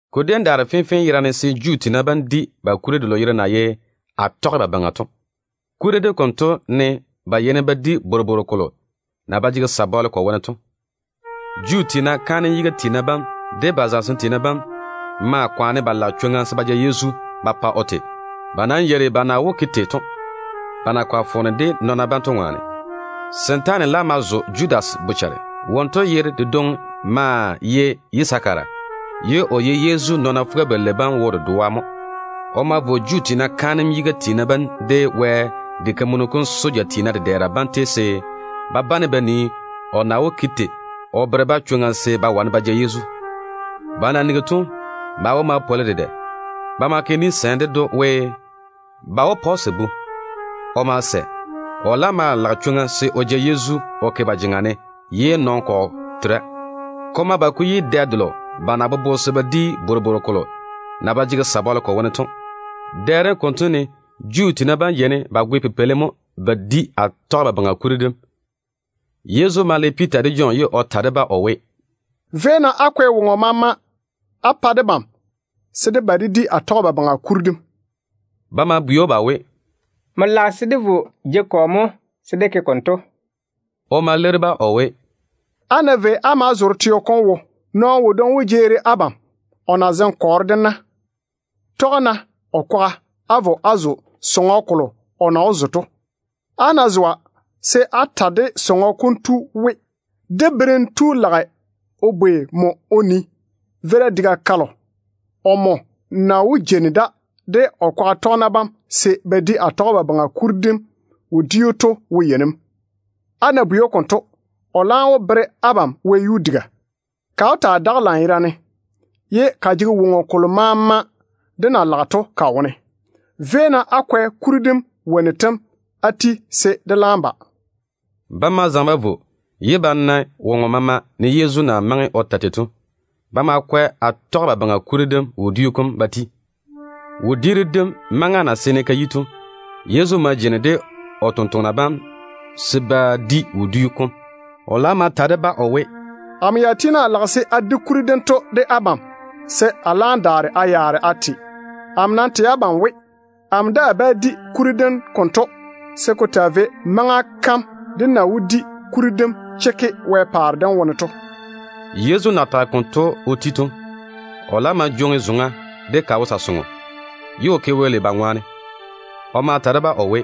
Ko déem daare fenfee yerane se Juu tiina bam di ba kuri delo yere na ye Atɔgebabaŋa to. Kuri dem konto ne ba yeini ba di bworobworo-memene selo na ba jege sabɔle ko wone to. Juu tiina kaanem yiga tiina bam de ba zamesem tiina bam maa kwaane ba lage chwoŋa se ba ja Yezu ba go. Ba nam yeiri ba na wó ke tei to, ba na kɔre foone de nɔɔna bam to ŋwaane. Setaane laam ma zo Judas bochare. Wonto yere dedwoŋi maa ye Yisakara, ye o ye Yezu nɔɔna fuga-balei bam wo dedoa mo. O ma vo Juu tiina kaanem yiga tiina bam, de Wɛ diga kam soja tiina dedɛɛra bam tei se ba bane ba nii o na wó ke tei o bere-ba chwoŋa se ba wane ba ja Yezu. Ba na nigi to, ba wo ma pwoli dedɛ. Ba ma ke ni-sɛɛm ded‑o we, ba wó pa‑o sabu. O ma sɛ. O laam maa lage chwoŋa se o ja Yezu o ke ba jeŋa ne ye nɔn-kɔgɔ tera. Ko ma ba ko yi dɛ delo ba na bobo se ba di Bworobworo-memene kuri dem to. Dɛ dem konto ne Juu tiina bam yeini ba goe pipeili mo ba ma di Atɔgebabaŋa kuri dem. Yezu ma le Piita de Jɔn ye o ta de-ba o we, “Véi-na á kwɛ woŋo maama á pa debam se dé ba dé di Atɔgebabaŋa kuri dem.” Ba ma bwei‑o ba we, “Nmo lage se dé vo jeiga kɔ mo se dé ke konto?” O ma leiri-ba o we, “Á ná vei á maa zoore teo kom wo, nɔɔno wodwoŋi wó jeeri abam o na zeŋe kɔɔro de na. Tɔge-na o kwaga á vo á zo sɔŋɔ kolo o na wó zo to. Á ná zoa, se á ta de sɔŋɔ kom tu we, ‘Dé Berem tu lage o bwei nmo o nii, veira diga kalo omo na wó jeini da de o kwaga tɔgena bam se ba di Atɔgebabaŋa kuri dem wodiu to wo yei ne mo?’ Á ná bwei‑o konto, o laam wó bere abam wɛyuu diga. Ka wó taa daga lanyerane, ye ka jege woŋo kolo maama dé na lage to ka wone. Véi-na á kwɛ kuri dem wonnu tem á ti se dé laam ba.” Ba ma zaŋe ba vo, ye ba na woŋo maama ne Yezu na maŋe o ta tei to. Ba ma kwɛ Atɔgebabaŋa kuri dem wodiu kom ba ti. Wodiiru dim maŋa na seene ka yi to, Yezu ma jeini de o totoŋa nakwa bam se ba di wodiu kom. O laam ma ta de-ba o we, “Amo ya tiini a lage se a di kuri dento de abam, se a laam daare a yaare a te. Amo nam tɛ abam we, amo daa bá di kuri dem konto se ko taa vei maŋa kam dé na wó di kuri dem chekke Wɛ paare dem wone to.” Yezu na tage konto o ti to, o laam ma jwoŋi zoŋa de ka wo sa-soŋo, ye o ke Wɛ lei ba ŋwaane. O ma ta de-ba o we,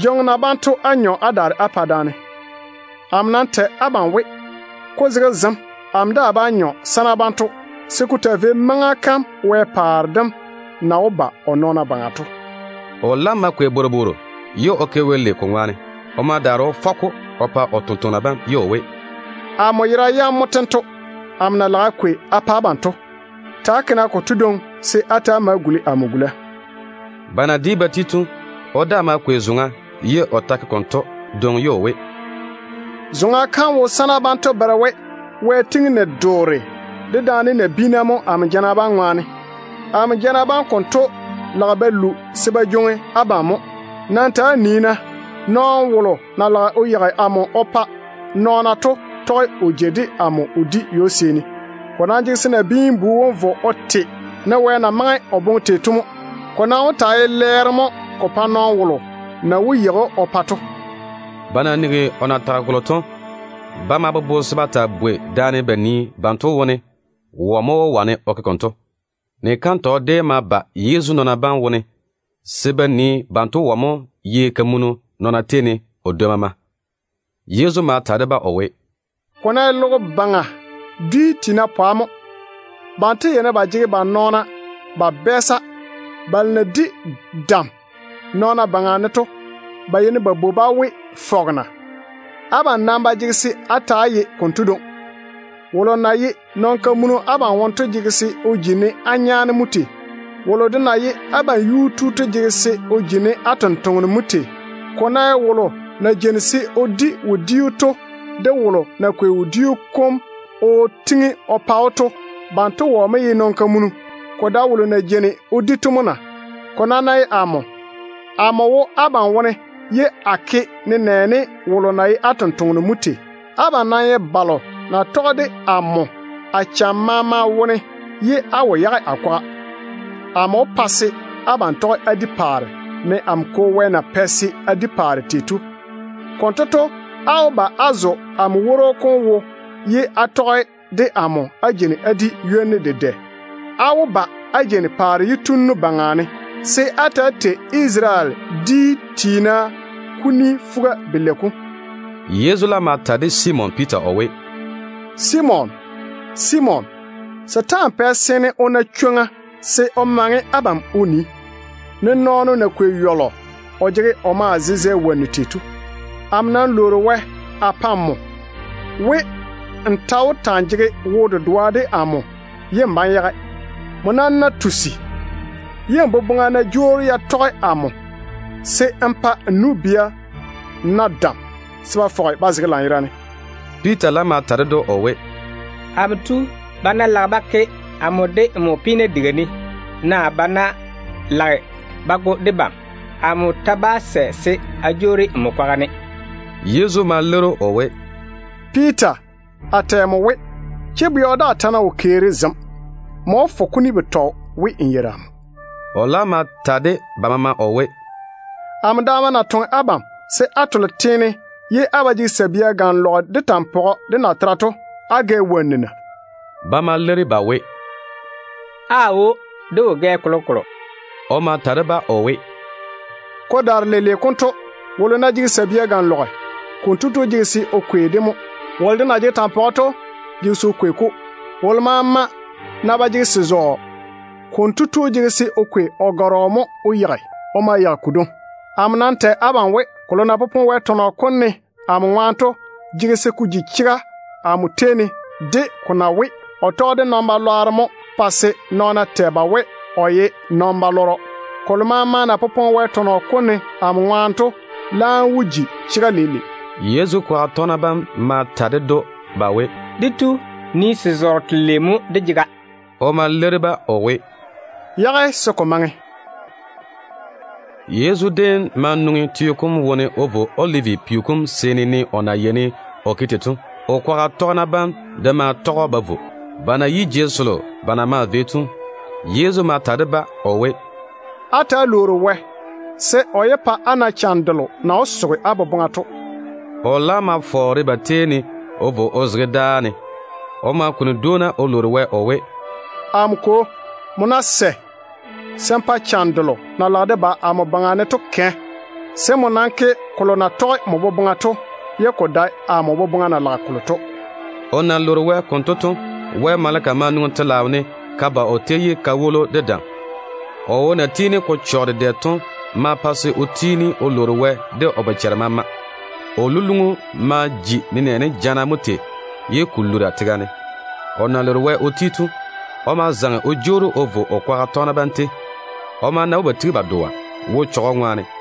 “Jwoŋi-na banto á nyɔ á daare á pa daane. Amo nam tɛ abam we, ko zege zem amo daa bá nyɔ sana banto se ko taa vei maŋa kam Wɛ paare dem na wó ba o nɔɔna baŋa to.” O laam ma kwei bworobworo ye o ke Wɛ lei ko ŋwaane. O ma daare o fɔ-ko o pa o tontoŋena bam ye o we, “Amo yera yam mo tento, amo na lage a kwei a pa abam to. Ta‑á ke-na konto dwoŋi se á ta‑á ma guli amo gula.” Ba na di ba ti to, o daa ma kwei zoŋa ye o ta ke konto dwoŋi, ye o we, “Zoŋa kam wo sana banto bere we Wɛ gwoni ni-doore dedaane nabiina mo amo jana bam ŋwaane. Amo jana bam konto lage ba pwori se ko jwoŋi abam ko yage mo. Nam ta‑á nii-na, nɔɔno wolo na lage o yeigi amo o pa nɔɔna to tɔge o jei de amo o di ywo-seeni. Ko nam jege se Nabiin-bu wom vo o te ne Wɛ boboŋa na jaane tei to mo. Ko nam wó taa ye lɛɛro mo ko pa nɔɔno wolo na wó yeigi‑o o pa to.” Ba na nigi o na tage kolo to, ba ma bobo se ba taa bwei daane ba nii banto wone wɔ mo wó wane o ke konto. Ni-kantɔgɔ déem ma ba Yezu nɔɔna bam wone se ba nii banto wone wɔ mo ye kamunu nɔɔna tei ne o dwoi maama. Yezu ma ta de-ba o we, “Ko ná ye logo baŋa teene pwa mo, banto yeini ba jege ba nɔɔna ba bɛɛsa. Balo na di dam nɔɔna baŋa ne to, ba yeini ba bwoi-ba we ‘fɔgena’. Abam nam ba jege se á ta‑á ye konto dwoŋi. Wolo na ye nɔn-kamunu abam wone to jege se o ji ne á nyaane mo tei. Wolo de na ye abam yuu tu to jege se o ji ne á tontoŋeno mo tei. Ko ná ye wolo na jeini se o di wodiu to de wolo na kwei wodiu kom o tiŋi o pa‑o to, banto wɔ mo ye kamunu? Ko dae wolo na jeini o di to mo na? Ko nam ná ye amo, amo wo abam wone ye a ke nenɛɛne wolo na ye á tontoŋeno mo tei. Abam nam ye balo na tɔge de amo a cham maama wone ye á wo yage a kwaga. Amo wó pa se abam tɔge á di paare, ne amo Kwo Wɛ na pɛ se a di paare tei to. Konto to, á wó ba á zo amo woro kom wo ye á tɔge de amo á jeini á di ywoni dedɛ. Á wó ba á jeini paare yitunnu baŋa ne, se á ta‑á tei Isarele dwia fuga-yalei yam.” Yezu laam ma ta de Simon Piita o we, “Simon, Simon, setaana pɛ seene o na chwoŋa se o maŋe abam o nii, ne nɔɔno na kwei yɔlɔ o jege o maa zezɛ wonnu tei to. Amo nam lwoori Wɛ a pa nmo we, n ta wó ta‑n jege wo-dedoa de amo ye n bá‑n yage. Nmo nam ná tusi, ye n boboŋa ná jwoori ya tɔge amo, se n pa n nu-bia na dam se ba fɔge ba zege lanyerane.” Piita laam ma ta ded‑o o we, “Amo tu, ba ná lage ba ke amo de nmo peena diga ne, naa ba ná lage ba go debam de, amo ta bá sɛ se a jwoori nmo kwaga ne.” Yezu ma leiri‑o o we, “Piita, a tɛ nmo we, chebɛɔ daa ta ná wo keeri zem, nmo wó fo kuni betɔ we, n yeiri amo.” O laam ma ta de ba maama o we, “Amo ya na toŋe abam se á tole teene ye á ba jege sabia ganlɔgere, de tampɔgɔ, de natera to, á gɛ wonnu na?” Ba ma leiri ba we, “Aawo, de wo gɛ kolokolo.” O ma ta de-ba o we, “Ko daare leile konto, wolo ná jege sabia ganlɔgere, konto tu jege se o kwei-de o ja vo mo. Wolo de na jege tampɔgɔ to jege se o kwei-ko. Wolo maama ná ba jege se-zɔɔ, konto tu jege se o kwei o gɔrɔ mo o yeigi o ma yeigi se-zɔɔ. Amo nam tɛ abam we, kolo na popone Wɛ tɔnɔ kom ne amo ŋwaane to jege se ko ji chega amo tei ne de ko na we, ‘Nɔɔna pɛ o ye wɛ-lwɛɛna bam wone dedoa.’ Kolo maama na popone Wɛ tɔnɔ kom ne amo ŋwaane to laam wó ji chega leile.” Yezu kwaga tɔgena bam ma ta ded‑o ba we, “Dé tu, nii se-zɔɔro telei mo dé jega.” O ma leiri-ba o we, “Yage-na se ko maŋe.” Yezu déem ma nwoŋi teo kom wone o vo Olivi peo kom seeni, ne o na yeini o ke tei to. O kwaga tɔgena bam de ma tɔge‑o ba vo. Ba na yi jei selo ba na maa vei to, Yezu ma ta de-ba o we, “Ta‑á lwoori-na Wɛ se á yé to cham delo na wó soge á boboŋa to wone.” O laam ma fɔɔre ba tei ne o vo o zege dáa ne. O ma kuni dwoona o lwoori Wɛ o we, “Amo Kwo, nmo ná sɛ, se n pa cham delo na lage de ba amo baŋa ne to kɛ de daare-ne. Nam ke kolo na tɔge nmo boboŋa to, ye ko dae amo boboŋa na lage kolo to.” O na lwoori Wɛ konto to, Wɛ maleka ma nwoŋi telaao ne ka ba o tei ye ka woli‑o de dam. O wo na tiini ko chɔge dedɛ to ma pa se o tiini o lwoori Wɛ de o bochare maama. O luluŋu ma ji nenɛɛne jana mo tei ye ko lura tega ne. O na lwoori Wɛ o ti to, o ma zaŋe o jwoori o vo o kwaga tɔgena bam tei. O ma na we ba tigi ba dɔa wo-chechɔgɔ ŋwaane.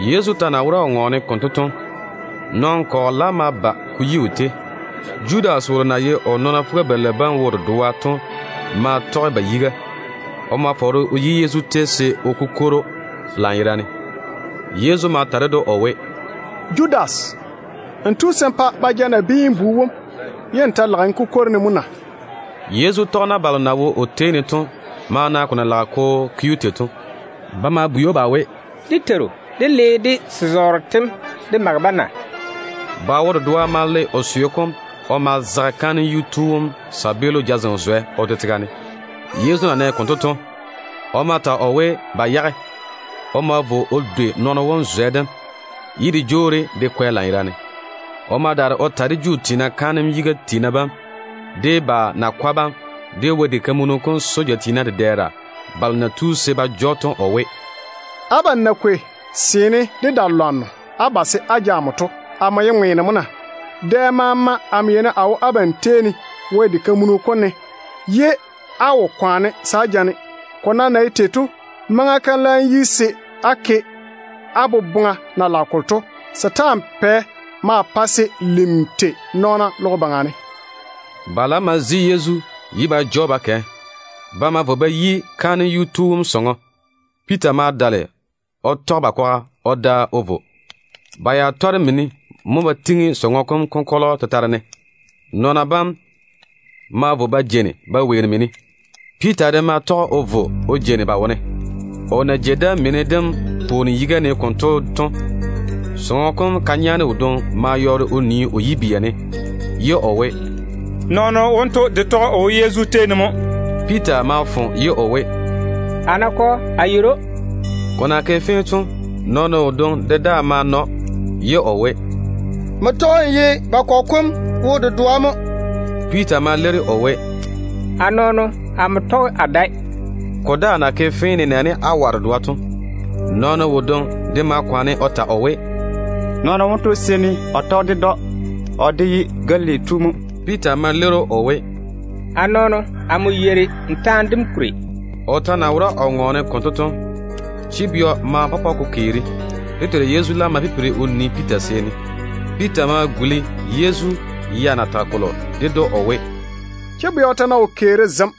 Yezu ta na wora o ŋɔɔne konto to, nɔn-kɔgɔ laam ma ba ko yi o tei. Judas wolo na ye o nɔɔna fuga-balei bam wo dedoa to ma tɔge ba yiga. O ma fɔɔre o yi Yezu tei se o kukwori‑o lanyerane. Yezu ma ta ded‑o o we, “Judas, n tu se n pa ba ja Nabiin-bu wom, ye n ta lage n kukwori-ne mo na?” Yezu tɔgena balo na wo o tei ne to ma na ko na lage ko ke‑o tei to. Ba ma bwei‑o ba we, “Dé Teiru, dé le dé se-zɔɔro tem dé ma zage-ba na?” Ba wo dedoa ma le o seo kom o ma zage kaanem yuu tu wom tontoŋeno jazem zwɛ o de tega ne. Yezu na nɛ konto to, o ma ta o we, ba yage! O ma vo o dwei nɔɔno wom zwɛ dem, ye de jwoori de kwɛ lanyerane. O ma daare o ta de Juu tiina kaanem yiga tiina bam, de ba nakwa bam, de Wɛ diga kam soja tiina dedɛɛra balo na tu se ba ja‑o to o we, “Abam na kwei seene de da-lwanno á ba se á ja amo to, amo ye ŋweeno mo na? Dɛ maama amo yeini a wo Wɛ wara-jei sem ne. Abam de tɔge á wora ye á wo kwaane se á ja-ne. Ko nam na ye tei to, maŋa kam laam yi se á ke á boboŋa na lage kolo to. Setaana pɛ maa pae se lim tei nɔɔna logo baŋa ne.” Ba laam ma zi Yezu ye ba ja‑o ba kɛ. Ba ma vo ba yi kaanem yuu tu wom sɔŋɔ. Piita ma dale o tɔge ba kwaga o da o vo. Ba ya tɔre mini mo ba tiŋi sɔŋɔ kom konkɔlɔ tetare ne. Nɔɔna bam ma vo ba jeini ba weeri mini dem. Piita de ma tɔge o vo o jeini ba wone. O na jei da mini dem pwooni yiga ne konto to, sɔŋɔ kom ka-nyaane wodwoŋi ma yɔɔre o nii o yibia ne ye o we, “Nɔɔno wonto de tɔge o wo Yezu tei ne mo.” Piita ma fo ye o we, “A nakɔ, a yeiri‑o.” Ko na ke fee to, nɔɔno wodwoŋi de daa ma na‑o, ye o we, “Nmo tɔge n ye ba kɔgɔ kom wo dedoa mo.” Piita ma leiri o we, “A nɔɔno, amo tɔge a dae.” Ko daa na ke fee nenɛɛne awa dedoa to, nɔɔno wodwoŋi de ma kwaane o ta o we, “Nɔɔno wonto seene o tɔge ded‑o. O de ye Galili tu mo.” Piita ma leiri‑o o we, “A nɔɔno, ta-yɔɔro mo n jege n ŋɔɔna.” O ta na wora o ŋɔɔne konto to, chebɛɔ ma pɔpɔ ko keeri. Dé Teiru Yezu laam ma pipiri o nii Piita seeni. Piita ma guli Yezu ya na tage kolo ded‑o o we, “Chebɛɔ ta ná wo keeri zem,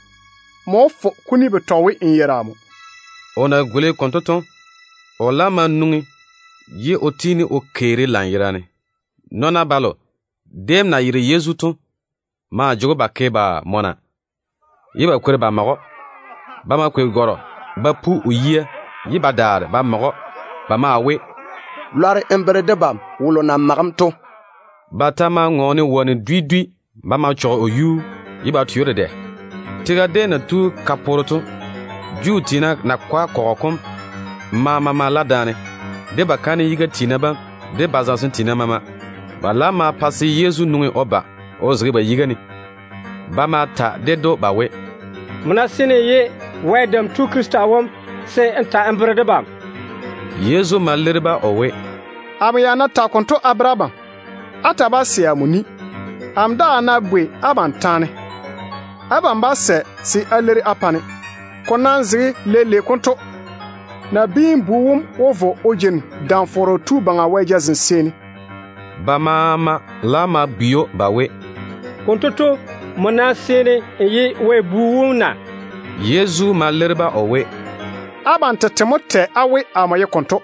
nmo wó fo kuni betɔ we n yeiri amo.” O na guli konto to, o laam ma nwoŋi ye o tiini o keeri lanyerane. Nɔɔna balo déem na yere Yezu to maa jege‑o ba ke ba mɔna ye ba kwori ba mage‑o. Ba ma kwei gɔrɔ ba pu o yia ye ba bwei‑o we, “Lɔre n bere debam wolo na mage‑m to.” Ba ta maa ŋɔɔne wonnu dwi dwi ba ma chɔge o yuu ye ba twe‑o dedɛ. Tega déem na tu ka poore to, Juu tiina nakwa kɔgɔ kom maama ma la daane, de ba kaanem yiga tiina bam, de ba zamesem tiina maama. Ba laam ma pa se Yezu nwoŋi o ba o zege ba yiga ne. Ba ma ta ded‑o ba we, “Nmo ná seene n ye Wɛ Dam Tu Krista wom, se n ta n bere debam.” Yezu ma leiri-ba o we, “Amo ya ná tage konto a bere abam, á ta bá sɛ amo ni. Amo daa ná bwei abam taane, abam bá sɛ se á leiri á pa-ne. Ko nam zege leile konto, Nabiin-bu wom wó vo o jeini Dam-fɔrɔ Tu Baŋa Wɛ jazem seeni.” Ba maama laam ma bwei‑o ba we, “Konto to, nmo nam seene n ye Wɛ Bu wom na?” Yezu ma leiri-ba o we, “Abam tete mo tɛ á we amo ye konto.”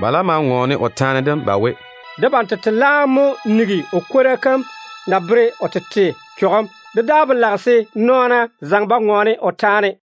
Ba laam ma ŋɔɔne o taane dem ba we, “Debam tete laam mo nigi o kwora kam na bere o tete chɔgem. Dé daa ba lage se nɔɔna zaŋe ba ŋɔɔne o taane dem.”